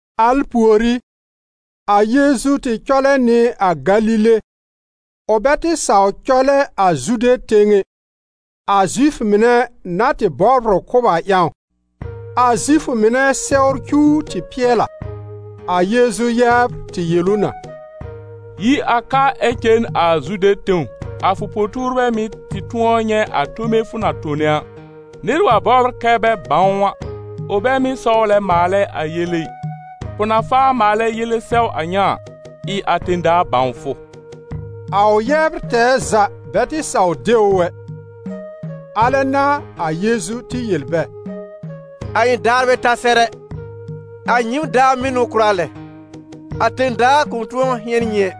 Al pùorí, a Yeezu tɩ cɔlɛ nɩ a Galile. Ʋ bɛ tɩ saw cɔlɛ a Zude tẽw ɛ, a Zifʋ mɩnɛ na tɩ bɔbr ʋ kʋ́b a ƴãw. A Zifʋ mɩnɛ Sɛwr cuw tɩ pɩɛl a. A Yeezu yɛbr tɩ yel ʋ na: «Yi a ka ɛ cen a Zude tẽw, a fʋ po-tuurbɛ mɩ̀ tɩ tʋ̃ɔ nyɛ̃ a tome fʋ na tone a. Nɩr wa bɔbr kɛ bɛ bãw ʋ a, ʋ bɛ mɩ́ sɔwlɛ maalɛ a yele ɩ. Fʋ na faa maalɛ yele sɛw a ŋa a, ɩ a tẽ-daa bãw fʋ!» A ʋ yɛbr tɛɛ za bɛ tɩ saw de ʋ ɛ. A lɛ n'a a Yeezu tɩ yel bɛ: «A ɩ̃ daar bɛ ta sɛr ɛ, a nyɩɩm daar mɩ́ n'ʋ kʋra lɛ. A tẽ-daa kʋ̃ tʋ̃ɔ hɩ̃ɛn nyɩ ɛ,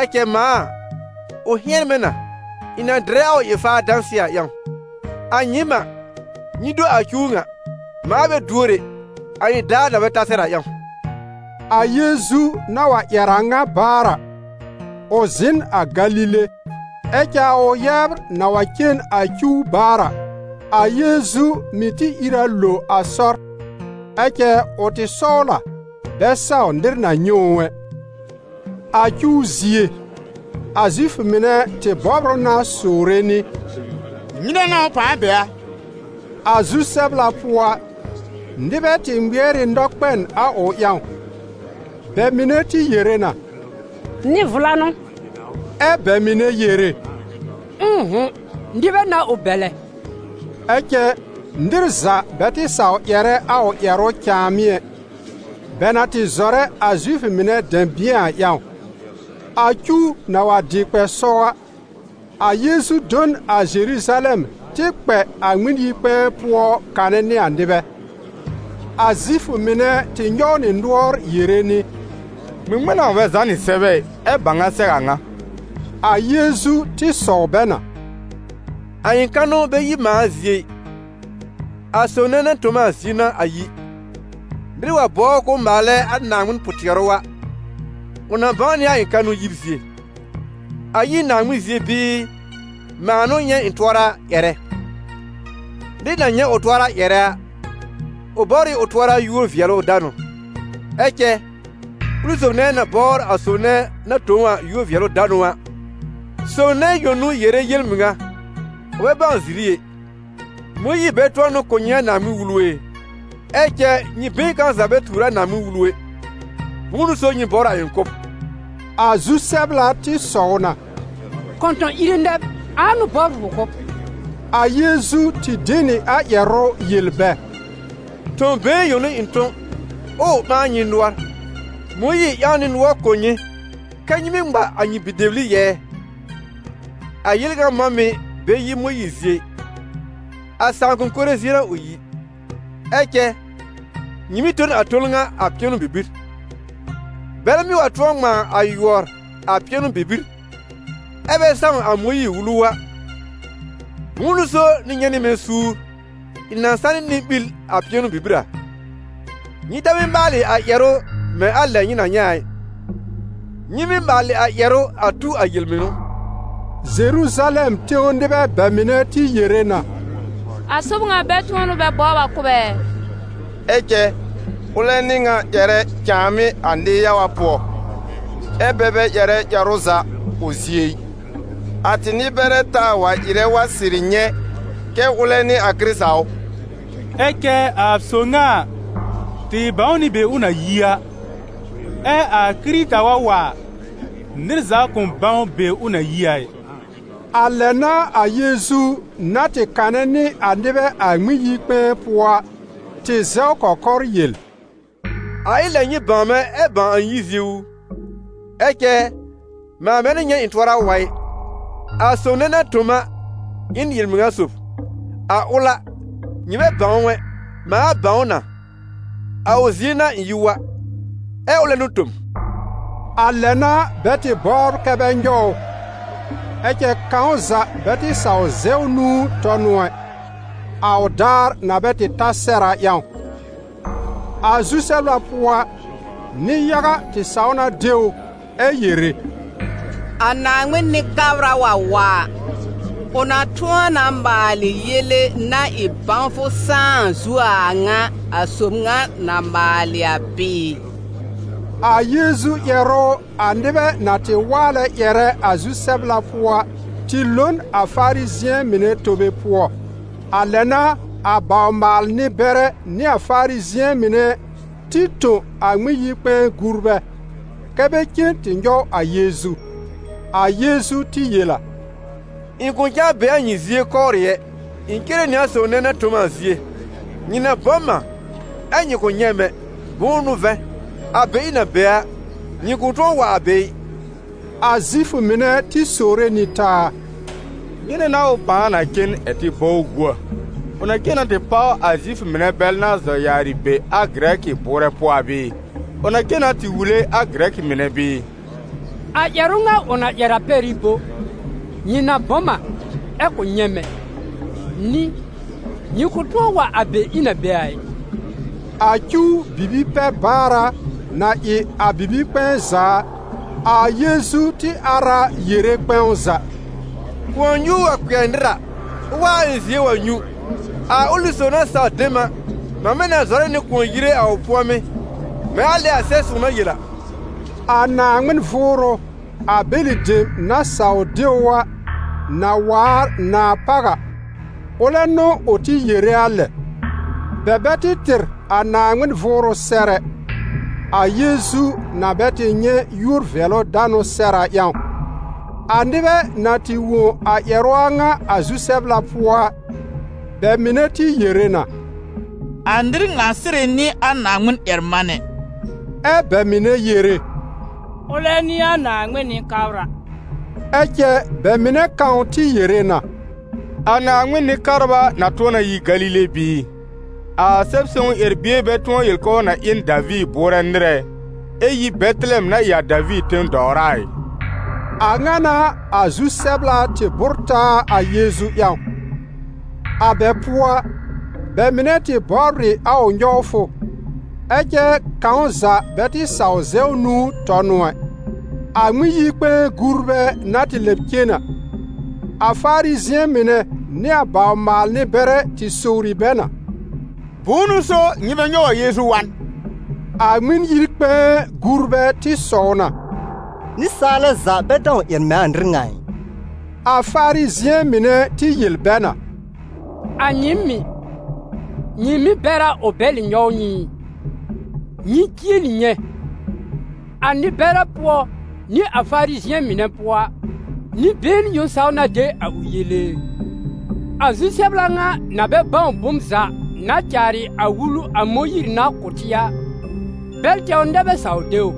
ɛ cɛ mãa a, ʋ hɩ̃ɛn mɛ̃ na, ɩ̃ na dɩrɛ a ʋ ɩ-faar dãsɩɛ a ƴãw. A nyɩɩm a, nyɩ do a cuw ŋa, mãa bɛ duor ɛ, a ɩ̃ daar na bɛ ta sɛr a ƴãw.» A Yeezu na wa ƴɛr a ŋa baar a, ʋ zɩ̃ n a Galile. Ɛ cɛ a ʋ yɛbr na wa cen a cuw baar a, a Yeezu mɩ̀ tɩ ìr a lo a sɔr, ɛ cɛ ʋ tɩ sɔwl a bɛ saw nɩr na nyɛ̃ ʋ ɛ. A cuw zie, a Zifʋ mɩnɛ tɩ bɔbr ʋ na sowre nɩ: «Nyɩnɛ n'a ʋ pãa be a?» A zu-sɛbla pʋɔ a, nɩbɛ tɩ ŋmɩɛr ɩ nɔkpɛn a ʋ ƴãw; bɛ mɩnɛ tɩ yere na: «Nɩ-vla n'ʋ.» Ɛ́ bɛ mɩnɛ yere: «Ʋ̃ʋ'hʋ̃. Nɩbɛ n'a ʋ bɛlɛ.» Ɛ cɛ, nɩr za bɛ tɩ saw ƴɛrɛ a ʋ ƴɛrʋ cãàmɩ́ ɛ, bɛ na tɩ zɔrɛ a Zifʋ mɩnɛ dɛ̃bɩ̃ɛ a ƴãw. A cuw na wa dɩ kpɛ sɔw a, a Yeezu do n a Zeruzalɛm tɩ kpɛ a Ŋmɩn-yi-kpɛ̃ɛ pʋɔ kanɛ nɩ a nɩbɛ. A Zifʋ mɩnɛ tɩ nyɔw nɩ nʋɔr yere nɩ: «Ŋmɩŋmɩn n'a ʋ bɛ zànɩ sɛbɛ ɩ, ɛ bãw a sɛw a ŋa?» A Yeezu tɩ sɔw bɛ na: «A ɩ̃ kanʋ bɛ yi mãa zie ɩ, a sob nɛ na tõ m a zie n'a a yi. Nɩr wa bɔbr k'ʋʋ maalɛ a Naaŋmɩn pʋ-tɩɛrʋ a, ʋ na bãw nɩ a ɩ̃ kanʋ yib zie: a yi n Naaŋmɩn zie bɩɩ, mãa n'ʋ nyɛ̃ ɩ̃ tʋɔra ƴɛrɛ. Nɩr na nyɛ̃ ʋ tʋɔra ƴɛrɛ a, ʋ bɔbr ɩ ʋ tʋɔra yúor-vɩɛlʋ-danʋ; ɛ cɛ ʋlɩ sob nɛ na bɔbr a sob nɛ na tõ ʋ a yúor-vɩɛlʋ-danʋ a, sob nɛ yõ n'ʋ yere yel-mɩŋa, ʋ bɛ bãw ziri ɛ. Mõyiir bɛ tʋ̃ɔ n'ʋ kʋ̀ nyɩ a Naaŋmɩn-Wulu ɛ? Ɛ cɛ nyɩ been kãw za bɛ tuur a Naaŋmɩn-Wulu ɛ, bʋ̃ʋ n'ʋ so nyɩ bɔbr a ɩ̃ kʋ́b?» A zu-sɛbla tɩ sɔw na: «Kɔ̃tɔ̃-ire nɛ b! Ãa n'ʋ bɔbr fʋ kʋ́b?» A Yeezu tɩ de nɩ a ƴɛrʋ yel bɛ: «Tõ-been yõ n'ʋ ɩ̃ tõ, ɛ ʋ ɓãa nyɩ nʋɔr. Mõyiir ƴãw nɩ nʋɔr kʋ̀ nyɩ kɛ́ nyɩ mɩ́ ŋma a nyɩ bi-dɛbli yɛɛ - a yel ŋa mɔ̃ mɩ̀ bɛ yi Mõyiir zie ɩ, a sãakʋm mɩnɛ zie n'a ʋ yi - ɛ cɛ nyɩ mɩ́ tõ n a ton ŋa a pɩɛnʋ-bibir. Bɛlɛ mɩ́ wa tʋ̃ɔ ŋmãa a yʋɔr a pɩɛnʋ-bibir, ɛ́ bɛ sãw a Mõyiir-Wulu a, bʋ̃ʋ n'ʋ so nyɩ nyɛ̃ nɩ mɛ̃ suur ɩ̃ na sanɩ nɩ-ɓil a pɩɛnʋ-bibir a? Nyɩ ta mɩ́ maalɩ a ƴɛrʋ mɛ̃ a lɛ nyɩ na nyɛ̃ a, nyɩ mɩ́ maalɩ a ƴɛrʋ a tu a yel-mɩnʋ.» Zeruzalɛm tẽw nɩbɛ bɛ mɩnɛ tɩ yere na: «A sob ŋa bɛ tʋ̃ɔ n'ʋ bɛ bɔbr a kʋ́b ɛ? Ɛ cɛ ʋlɛ n'ɩ ŋa ƴɛrɛ cãàmɩ́ a nɩ-yaga pʋɔ, ɛ́ bɛ bɛ ƴɛrɛ ƴɛrʋ za ʋ zie ɩ! A tɩ nɩ-bɛrɛ taa wa ɩrɛ wa sɩrɩ nyɛ̃ kɛ ʋlɛ n'ɩ a Kɩrɩta ʋ? Ɛ cɛ a sob ŋa a, tɩ bãw nɩ be ʋ na yi a. Ɛ a Kɩrɩta wa wa a, nɩr za kʋ̃ bãw be ʋ na yi a ɩ.» A lɛ n'a a Yeezu, na tɩ kanɛ nɩ a nɩbɛ a Ŋmɩn-yi-kpɛ̃ɛ pʋɔ a, tɩ zɛw kɔkɔr yel: «A ɩ lɛ nyɩ bãw mɛ̃, ɛ bãw a ɩ̃ yib zie u! Ɛ cɛ mãa bɛ n'ʋ nyɛ̃ ɩ̃ tʋɔra wa ɩ. A sob nɛ na tõ m a ɩ n yel-mɩŋa sob. A ʋl a, nyɩ bɛ bãw ʋ ɛ. Mãa bãw ʋ na: a ʋ zie n'a ɩ̃ yi wa, ɛ ʋlɛ n'ʋ tõ m.» A lɛ n'a bɛ tɩ bɔbr kɛ bɛ nyɔw ʋ; ɛ cɛ kãw za bɛ tɩ saw zɛw nũu tɔ n ʋ ɛ, a ʋ daar na bɛ tɩ ta sɛr a ƴãw. A zu-sɛbla pʋɔ a, nɩ-yaga tɩ saw na de ʋ ɛ yere: «A Naaŋmɩn Nɩ-kabra wa wa a, ʋ na tʋ̃ɔ na maalɩ yele-na-ɩ-bãwfʋ-sãá a zuo a a ŋa a sob ŋa na maalɩ a bɩɩ?» A Yeezu ƴɛrʋ, a nɩbɛ na tɩ waalɛ ƴɛrɛ a zu-sɛbla pʋɔ a, tɩ lo n a Farizɩ̃ɛ mɩnɛ tobe pʋɔ. A lɛ n'a a bawr-maal-nɩ-bɛrɛ nɩ a Farizɩ̃ɛ mɩnɛ tɩ tõ a Ŋmɩn-yi-kpɛ̃ɛ gurbɛ, kɛ́ bɛ cen tɩ nyɔw a Yeezu. A Yeezu tɩ yel a: «Ɩ̃ kʋ̃ cãa be a nyɩ zie kɔwrɩ ɛ, ɩ̃ cere nɩ a sob nɛ na tõ m a zie. Nyɩ na bɔ m a, ɛ nyɩ kʋ̃ nyɛ̃ m ɛ, bʋ̃ʋ n'ʋ vɛ̃, a be ɩ̃ na be a, nyɩ kʋ̃ tʋ̃ɔ wa a be ɩ.» A Zifʋ mɩnɛ tɩ sowre nɩ taa: «Nyɩnɛ n'a ʋ pãa na cen ɛ̀ tɩ bɔ ʋ gu a? Ʋ na cen na tɩ páw a Zifʋ mɩnɛ bɛl na zɔ yaarɩ be a Gɩrɛkɩ bʋʋrɛ pʋɔ a bɩɩ? Ʋ na cen na tɩ wule a Gɩrɛkɩ mɩnɛ bɩɩ? A ƴɛrʋ ŋa ʋ na ƴɛr a pɛr ɩ bo: ‹Nyɩ na bɔ m a, ɛ kʋ̃ nyɛ̃ m ɛ›? Nɩ: ‹Nyɩ kʋ̃ tʋ̃ɔ wa a be ɩ̃ na be a ɩ?›» A cuw bibi-pɛ-baara, na ɩ a bibi-kpɛ̃ɛ za a, a Yeezu tɩ ar a yere kpɛ̃w za: «Kʋ̃ɔ-nyuur wa kpɩɛr nɩr a, ʋ wa a ɩ̃ zie wa nyũ, ‹A ʋlɩ sob na saw de m a, mamɛ na zɔrɛ nɩ kʋ̃ɔ yire a ʋ pʋ̃ɔmɩ́›, mɛ̃ a lɛ a Sɛb-sõw na yel a.» A Naaŋmɩn Vʋʋrʋ, a bɛlɩ dem na saw de ʋ a, na waar nãá páw a, ʋlɛ n'ʋ ʋ tɩ yere a lɛ. Bɛ bɛ tɩ tɩr a Naaŋmɩn Vʋʋrʋ sɛr ɛ, a Yeezu na bɛ tɩ nyɛ̃ yúor-vɩɛlʋ-danʋ sɛr a ƴãw. A nɩbɛ na tɩ wõ a ƴɛrʋ a ŋa a zu-sɛbla pʋɔ a, bɛ mɩnɛ tɩ yere na: «A nɩr ŋa sɩrɩ n'ɩ a Naaŋmɩn-ƴɛr-manɛ!» Ɛ bɛ mɩnɛ yere: «Ʋlɛ n'ɩ a Naaŋmɩn Nɩ-kabra!» Ɛ cɛ bɛ mɩnɛ kãw tɩ yere na: «A Naaŋmɩn Nɩ-kabra na tʋ̃ɔ na yi Galile bɩɩ? A Sɛb-sõw ƴɛr-bie bɛ tʋ̃ɔ yel k'ʋʋ na ɩ n Daviir bʋʋrɛ nɩr ɛ, ɛ yi Bɛtɩlɛm na ɩ a Daviir tẽ-dɔwra a ɩ?» A ŋa n'a a zu-sɛbla tɩ bʋ́r taa a Yeezu ƴãw. A bɛ pʋɔ a, bɛ mɩnɛ tɩ bɔbr ɩ a ʋ nyɔwfʋ, ɛ cɛ kãw za bɛ tɩ saw zɛw nũu tɔ n ʋ ɛ. A Ŋmɩn-yi-kpɛ̃ɛ gurbɛ na tɩ lɛb cen a, a Farizɩ̃ɛ mɩnɛ nɩ a bawr-maal-nɩ-bɛrɛ tɩ sowri bɛ na: «Bʋ̃ʋ n'ʋ so nyɩ bɛ nyɔw a Yeezu wa n?» A Ŋmɩn-yi-kpɛ̃ɛ gurbɛ tɩ sɔw na: «Nɩsaalɛ za bɛ dãw ƴɛr mɛ̃ a nɩr ŋa a ɩ!» A Farizɩ̃ɛ mɩnɛ tɩ yel bɛ na: «A nyɩɩm mɩ̀, nyɩ mɩ̀ bɛr a ʋ bɛlɩ nyɔw nyɩ ɩ? Nyɩ jieli nyɛ̃, a nɩ-bɛrɛ pʋɔ nɩ a Farizɩ̃ɛ mɩnɛ pʋɔ a, nɩ-been yõ saw na de a ʋ yele e? A zu-sɛbla ŋa na bɛ bãw bom za na caarɩ a Wulu a Mõyiir na kʋ̀ tɩ a, bɛl tɛwr nɛ bɛ saw de ʋ.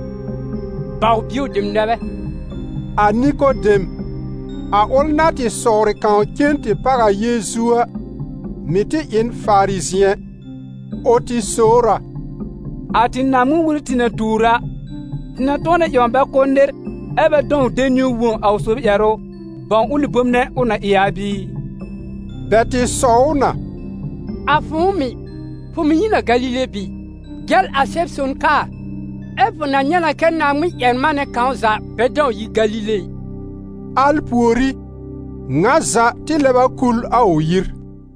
Baw-bio dem nɛ bɛ!» A Nikodem, a ʋl na tɩ sɔwrɩ kãw cen tɩ páw a Yeezu a, mɩ̀ tɩ ɩ n Farizɩ̃ɛ. Ʋ tɩ sowr a: «A tɩ Naaŋmɩn-Wulu tɩ na tuur a, tɩ na tʋ̃ɔ na ƴãw bɛ kʋ́ nɩr, ɛ́ bɛ dãw de niwn wõ a ʋ sob ƴɛrʋ, bãw ʋlɩ bom nɛ ʋ na ɩ a bɩɩ?» Bɛ tɩ sɔw ʋ na: «A fʋ̃ʋ mɩ̀, fʋ mɩ́ yi n a Galile bɩɩ? Jɛl a Sɛb-son kaa, ɛ́ fʋ na nyɛ̃ na kɛ Naaŋmɩn-ƴɛr-manɛ kãw za bɛ dãw yi Galile ɩ.» [ Al pùorí, ŋa za tɩ lɛb a kul a ʋ yir.